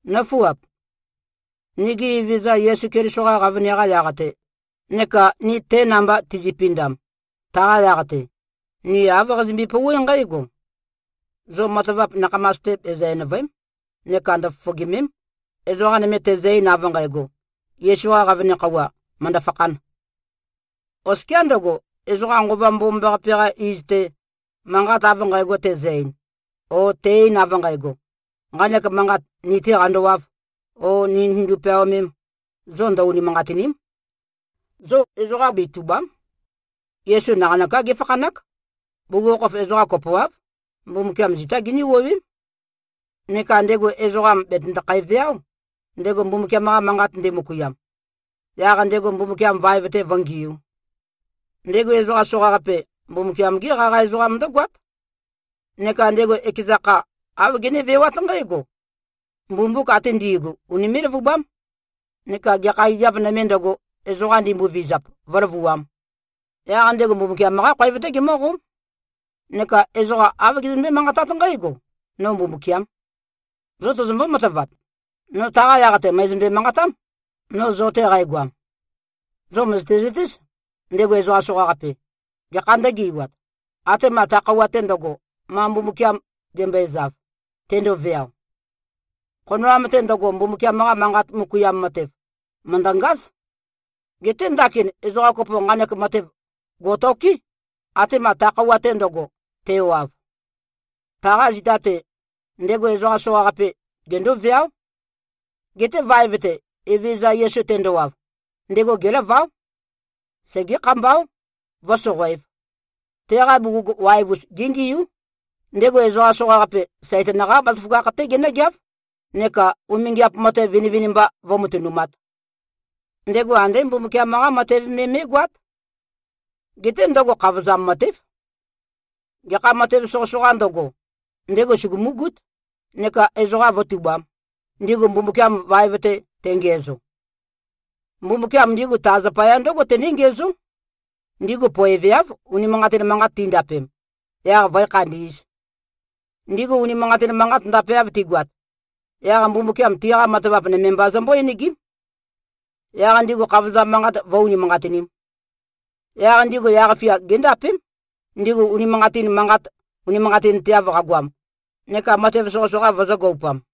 Nǿfuap! Nigi Evezøza Yesu Keliso-qa qavøne-qa yaq-te neka ni te namba tizipindam, taqa yaq-te, ni āv qazimbi-pouwé nqǽgo: Zo matavap nakhamas-te, bezø-enø̀vøe᷄m neka ndøfofogìme᷄m, ezoqa nøme tezø-ein, av nqægo, Yesu-qa qavøne khøuwa mø̀ndø-fakhān. Oskiá ndøgo, ezoqa Nqova Mbomambaqape-qa iz-te, manqat av nqægo tezø-ein, o te-ein av nqægo, nqanek manqat ni-tē qandowāv o nī nitøndu-peaomēm, zo ndø-unimanqatìni᷄m. Zo ezoqa betùba᷄m. Yesu naqanøká géfakhanák. Bugukhokhof ezoqa kopoáv, Mbumbukiam zitá giní-wuowém. Neka ndego ezoqam bètøndokhæ-veáo, ndego Mbumbukiam-qa manqat ndemøkuiam, yaq ndego Mbumbukiam vaev-te vǿngiū. Ndego ezoqa soqaqape, Mbumbukiam-gé qaqa ezoqam ndǿgoát. Neka ndego ekeza kha, āv genévewát nqǽgo: Mbumbuk ate ndi꞉gu, unimé꞉-løvubám, neka gekha gigiap nømē ndøgo, ezoqa ndimbovizap, vǿløvuām. Yaq ndego Mbumbukiam-qá khoev-té gemǿqóm. Neka ezoqa āv gezømbé-manqatát nqǽgo, “No Mbumbukiām.” Zo tozombó-matavap? No taqa yaq-te mø̀ezømbe-manqatám, no zo-te qægoam. Zo mø̀zøte-zøtéz, ndego ezoqa soqaqape, gekha ndø̄geiwat, atema ta khøuwa-te ndøgo, ma Mbumbukiam gembøezav, tendoveao. Khonoam-te ndøgo, Mbumbukiam-qa Manqat møkuiam matev, mø̀ndøngáz. Geté ndakin ezoqa kopo nqanek matev gò꞉toké, atema ta khøuwa-te ndøgo, tewav. Taqa zita-te, ndego ezoqa soqaqape gendóveáo. Geté vaev-te, Evezøza Yesu tendowav, ndego gélaváo. Segé-khambáo, vǿsoqoēv. Teqa bugug waev-us, géngiú. Ndego ezoqa soqaqape, Saitan-qá bazaføgakh-té genǿgeáv, neka umingiap matev vinivinimba vǿmatønumāt. Ndego andé Mbumbukiam-qá matev me mé꞉goát. Geté ndøgo khavozam matév. Gekha matev soqøsoqā ndøgo, ndego sugumúgút, neka ezoqa vǿtubām, ndigu Mbumbukiam vaev-te tengiæzo. Mbumbukiam ndigu ta zapaya ndǿgo tené-ngiæzó: Ndigu poeveáv, unimanqatin manqat tindapem, yaq vǿe-khandī꞉z. Ndigu unimanqatin manqat ndapeav tigoat, yaq Mbumbukiam tiqa matavap nøme mba zømbó-enegím. Yaq ndigu khavozam manqat vǿ-unimanqatinīm. Yaq ndigu yaq-fia géndapém, ndigu unimanqatin manqat unimanqatinteav qagoam neka matev soqøsoqa vøzø̄-goupam.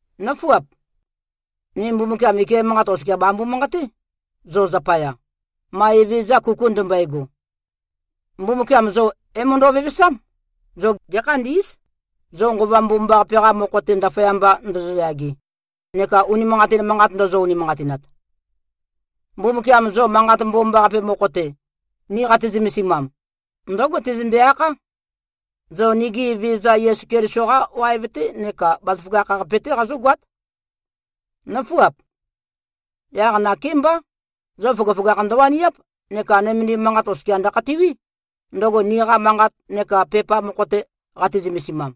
Nǿfuap! Ni Mbumbukiam ike manqat oskia bambu-manqaté, zo zapaya, ma Evezøza kuku ndømbøego. Mbumbukiam zo é-møndo꞉-vevesám, zo gēkhandī꞉z, zo Nqova Mbomambaqape-qa mokho-te, ndaføyamba ndozoyage neka unimanqatin manqat ndōzō-ūnīmānqātīnāt. Mbumbukiam zo Manqat Mbomambaqape mokho-te, ni qati-zømesimam, ndǿgo tezømbe-akhá: Zo nigi Evezøza Yesu Keliso-qá waev-té neka bazaføgakh-qape-té qazógoát. Nǿfuap! Yaq nakémbá, zo føgøføgakh ndøwaniáp neka nømendim manqat oskia ndøkhatiwí, ndøgo niqa manqat neka pepa mokho-te qati-zømesimam.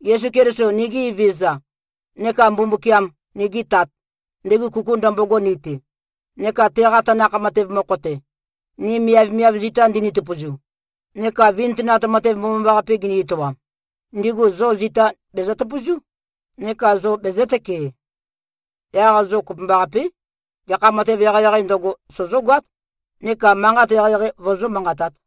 Yesu Keliso, nigi Evezøza, neka Mbumbukiam, nigi Tat, ndego kuku ndømbogo ni-te, neka teqa tanakh matev mokho-te, ni miavmiav zita ndini-tøpøzu neka vintønat matev mbomambaqape gini-etoam, ndigu zo zita bezøtøpøzú, neka zo bezø̄tøkee. Yaq zo kopømbaqapé, gekha matev eqeieqeī ndøgo, sozógoát neka manqat eqeieqei vozó-manqatāt.